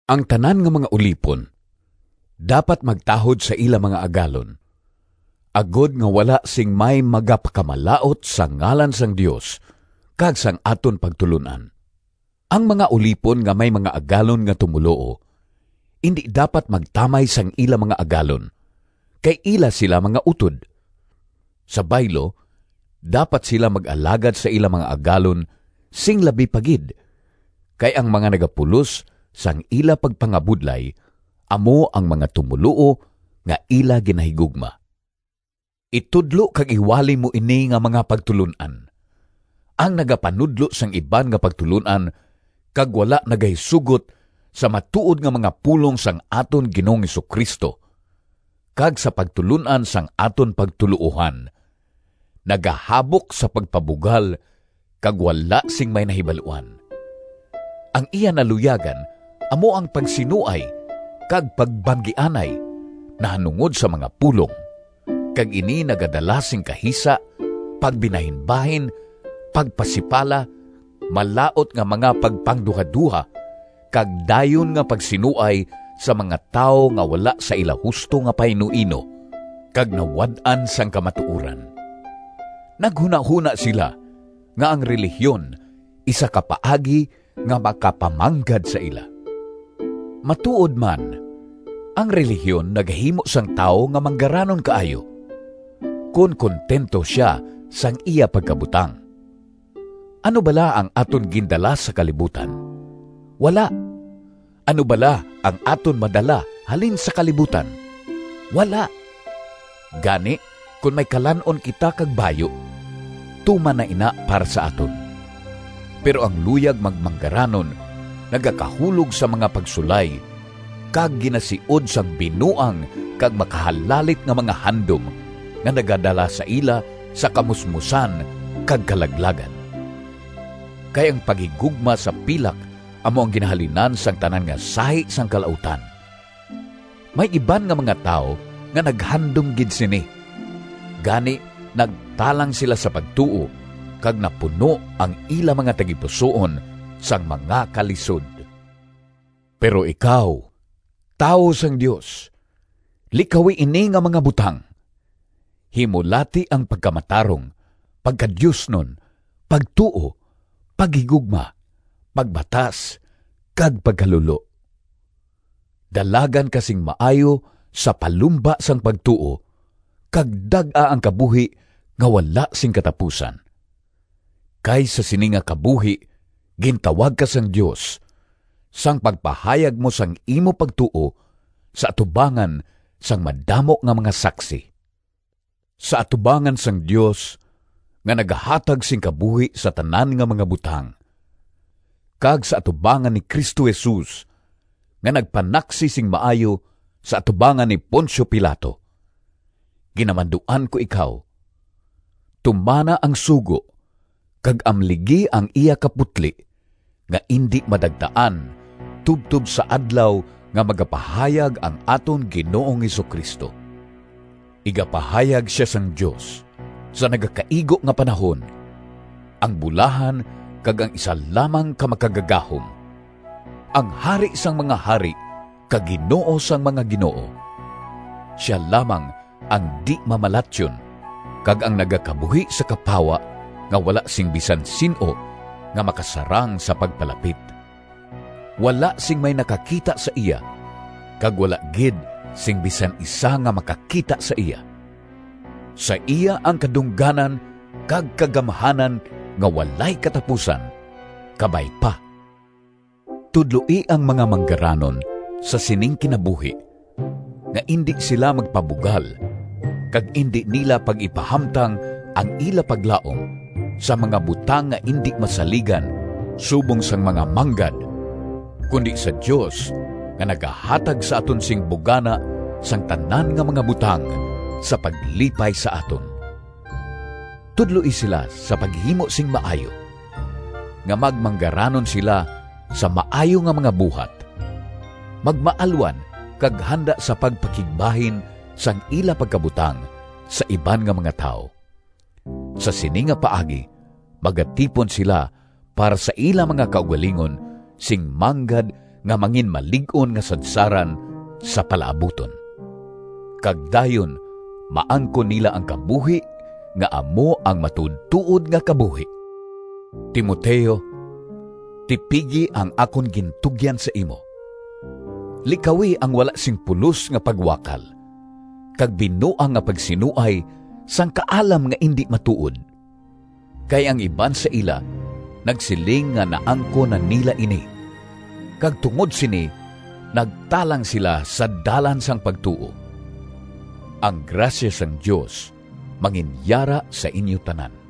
Ang tanan nga mga ulipon dapat magtahod sa ila mga agalon, agod nga wala sing may magapakamalaut sang ngalan sang Dios kag sang aton pagtulon-an. Ang mga ulipon nga may mga agalon nga tumoluo indi dapat magtamay sang ila mga agalon, kay ila sila mga utod. Sa baylo, dapat sila mag-alagad sa ila mga agalon sing labi pa gid, kay ang mga nagapulos sang ila pagpangabudlay amo ang mga tumoluo nga ila ginahigugma. Itudlo kag iwali mo ini nga mga pagtulon-an. Ang nagapanudlo sang iban nga pagtulon-an kag wala nagahisugot sa matuod nga mga pulong sang aton Ginoong Jesu-Cristo kag sa pagtulon-an sang aton pagtuloohan, nagahabok sa pagpabugal kag wala sing may nahibaluan. Ang iya naluyagan amo ang pagsinuay kag pagbanggianay nahanungod sa mga pulong, kag ini nagadala sing kahisa, pagbinahinbahin, pagpasipala, malaut nga mga pagpangduhadoha, kag dayon nga pagsinuay sa mga tawo nga wala sa ila husto nga painuino kag nawad-an sang kamatuoran. Naghunahona sila nga ang relihiyon isa ka paagi nga makapamanggad sa ila. Matuod man, ang relihiyon nagahimo sang tawo nga manggaranon kaayo, kon kuntento sia sang iya pagkabutang. Ano bala ang aton gindala sa kalibutan? Wala! Ano bala ang aton madala halin sa kalibutan? Wala! Gani, kon may kalan-on kita kag bayu, tuman na ina para sa aton. Pero ang luyag magmanggaranon nagakahulog sa mga pagsulay kag ginasiod sang binuang kag makahalalit nga mga handom nga nagadala sa ila sa kamusmosan kag kalaglagan. Kay ang paghigugma sa pilak amo ang ginahalinan sang tanan nga sahi sang kalautan. May iban nga mga tawo nga naghandom gid sini, gani nagtalang sila sa pagtuo kag napuno ang ila mga tagipusoon sang mga kalisod. Pero ikaw, tawo sang Dios, likawi ini nga mga butang. Himulati ang pagkamatarong, pagkadiosnon, pagtuo, paghigugma, pagbatas kag pagkalulo. Dalagan ka sing maayo sa palumba sang pagtuo kag dag-a ang kabuhi nga wala sing katapusan. Kay sa sini nga kabuhi gintawag ka sang Dios, sang pagpahayag mo sang imo pagtuo sa atubangan sang madamo nga mga saksi. Sa atubangan sang Dios nga nagahatag sing kabuhi sa tanan nga mga butang kag sa atubangan ni Cristo Jesus nga nagpanaksi sing maayo sa atubangan ni Poncio Pilato, ginamanduan ko ikaw: Tumana ang sugo kag amligi ang iya kaputli nga indi madagtaan tubtob sa Adlaw nga magapahayag ang aton Ginoong Jesu-Cristo. Igapahayag sia sang Dios sa nagakaigo nga panahon, ang bulahan kag ang isa lamang ka Makagagahom, ang Hari sang mga hari kag Ginoo sang mga ginoo. Sia lamang ang di-mamalatyon kag ang nagakabuhi sa kapawa nga wala sing bisan sin-o nga makasarang sa pagpalapit. Wala sing may nakakita sa iya kag wala gid sing bisan isa nga makakita sa iya. Sa iya ang kadungganan kag kagamhanan nga walay katapusan! Kabay pa. Tudloi ang mga manggaranon sa sining kinabuhi nga indi sila magpabugal kag indi nila pag-ipahamtang ang ila paglaom sa mga butang nga indi masaligan subong sang mga manggad, kundi sa Dios nga nagahatag sa aton sing bugana sang tanan nga mga butang sa paglipay sa aton. Tudloi sila sa paghimo sing maayo, nga magmanggaranon sila sa maayo nga mga buhat, magmaalwan kag handa sa pagpakigbahin sang ila pagkabutang sa iban nga mga tawo. Sa sini nga paagi magatipon sila para sa ila mga kaugalingon sing manggad nga manginmalig-on nga sadsaran sa palaabuton. Kag dayon maangkon nila ang kabuhi nga amo ang matuodtuod nga kabuhi. Timoteo, tipigi ang akon gintugyan sa imo. Likawi ang wala sing pulos nga pagwakal kag binuang nga pagsinuay sang “Kaalam” nga indi matuod. Kay ang iban sa ila nagsiling nga naangkon na nila ini, kag tungod sini nagtalang sila sa dalan sang pagtuo. Ang grasya sang Dios manginyara sa inyo tanan.